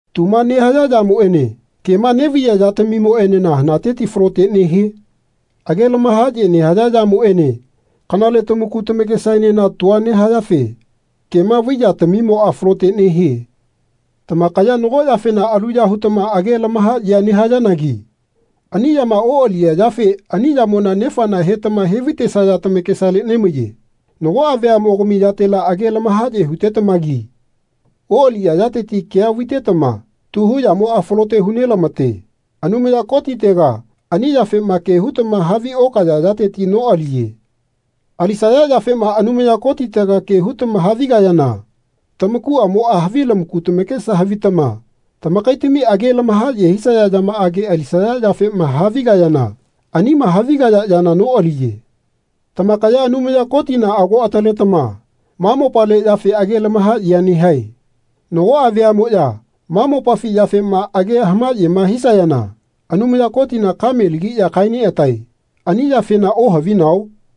Tuma nehaya yamoene kema nevaiya yatamimoenena hanateti falote nehie? Age lamahaye nehaya yamoene kanale tamaku tamakesamoenena tua nehayafe kema vai yatamimoa falote nehie. Tamakaya nago yafena aluya hutama age lamahayea nehayanagi ani yama oaliya yafe ani yamona nefana hetama he vaitesaya tamakesale nemaiye. Nagoa veamogami yatela age lamahaye hutetamagi oaliya yateti kea vaitetama tu hu yamoa falote hu nelamate. Anumaya Kotitega ani yafema ke hutama havi okaya yateti noaliye. Alisaya yafema Anumaya Kotitega ke hutama havigayana tamakuamoa havi lamaku tamakesa havitama tamakaitami age lamahaye hisaya yamaage alisaya yafema havigayana anima havigaya yana noaliye. Tamakaya Anumaya Kotina ago ataletama ma mopale yafe age lamahayea nehae. Nagoa veamoya ma mopafi yafema age hamayema hisayana Anumaya Kotina kame lagiya kae neatae. Ani yafena ohavinao?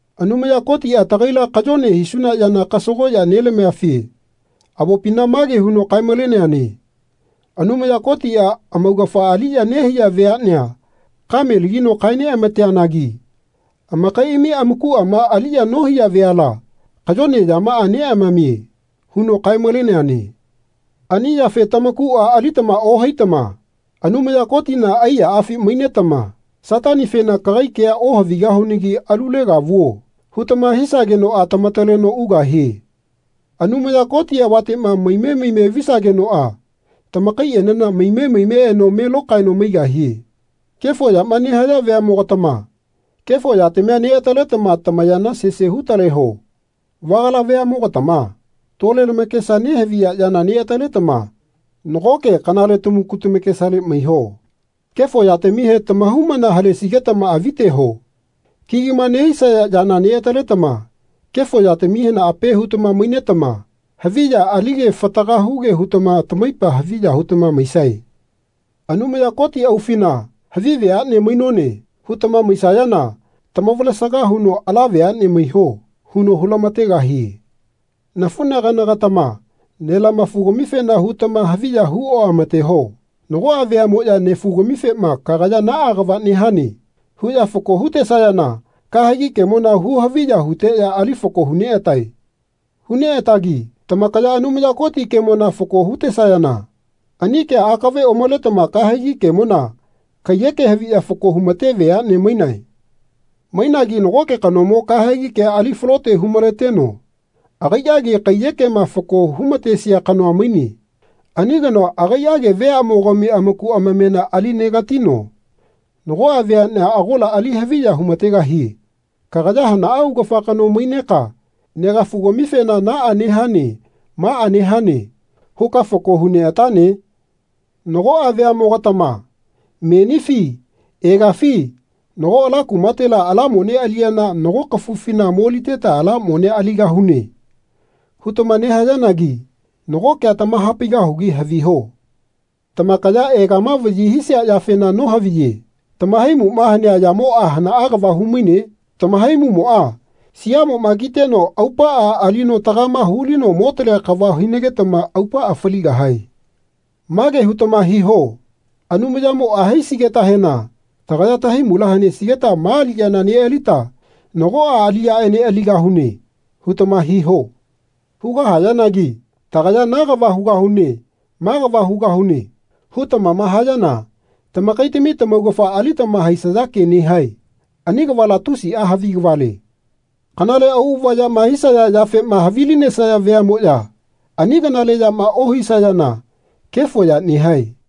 Anumaya Kotia tagaila kayone hisuna yana kasagoya nelamiafe avopina mage huno kae-maleneane Anumaya Kotia amaugafa aliya nehaiya veanea kame lagino kae neamateanagi amakaiami amakuama aliya nohaiya veala kayone yamaa neamamie. huno kae-maleneane. Ani yafe tamakua alitama ohaitama Anumaya Kotina aiyaafi mainetama Satanifena Kagai kea ohavigahunagi alulega vuo. hutama hisagenoa tamataleno ugahie. Anumaya Koti avatema mime mime visagenoa tamakaienena mime mime eno me lokaeno maigahie. Kefo yama nehaya veamogatama kefo yatamia neataletama tamayana sese hu-taleho. Vagala veamogatama tole lamakesa nehaviya yana neataletama nagoke kanale tamaku tamakesale maiho. Kefo yatamihe tamahaumana halesigetama aviteho. Kigima nehisaya yana neataletama kefo yatamihena ape hutama mainetama havi ya alige fataga huge hutama tamaipa haviya hutama maisae. Anumaya Koti aufina Havi veane mainone. hutama maisayana tamavalesaga huno Ala veane maiho. huno hu-lamategahie. Nafunagana-gatama nelamafu-gamifena hutama haviya hu oamateho. Nagoa veamoya nefugamifema Kagaya naa kava nehane. huya fako hutesayana kahegi kemona hu-haviya huteya ali fako hu neatae. Hu neatagi tamakaya Anumaya Koti kemona fako hutesayana ani kea akave omaletama kahegi kemona kaiyeke haviya fako humate veane mainae. Mainagi nagoke kanomo kahegi kea ali falote hu-maleteno agaiage kaiyekema fako hu-matesia kanoa maine. Ani kanoa agaiage veamogami amaku amamena ali negatino nagoa veanea agola ali haviya humategahie. Kagaya hanaa augafa kano maineka negafugamifena Naa nehane maa nehane. huka fako hu neatane? Nagoa veamogatama Menifi egafi nago ala kumatega ala mone aliyana nago kafufina moliteta ala monea aligahune. hutama nehayanagi nago kea tamahapaigahugi haviho. Tamakaya egama vayi hisia yafena nohaviye. Tamahaimuma hanea yamoa hanaa kava humaine? Tamahaimumoa siamoma kiteno aupaa alino tagama hulino motalea kava hinagetama aupaa faligahae. Mage hutama hiho Anumayamoa haisigetahena tagaya tahaimula hanesigeta ma aliyana nealita nagoa aliyaene aligahune. hutama hiho. Hugahayanagi Tagaya na kava hugahune ma kava hugahune. hutamama hayana tamakaitami tamaugafa alitama haisaya ke nehae. Ani kavala tusia havi kavale. Kanale auava yama hisaya yafema havilinesaya veamoya ani kanale yama ohisayana kefo ya nehae.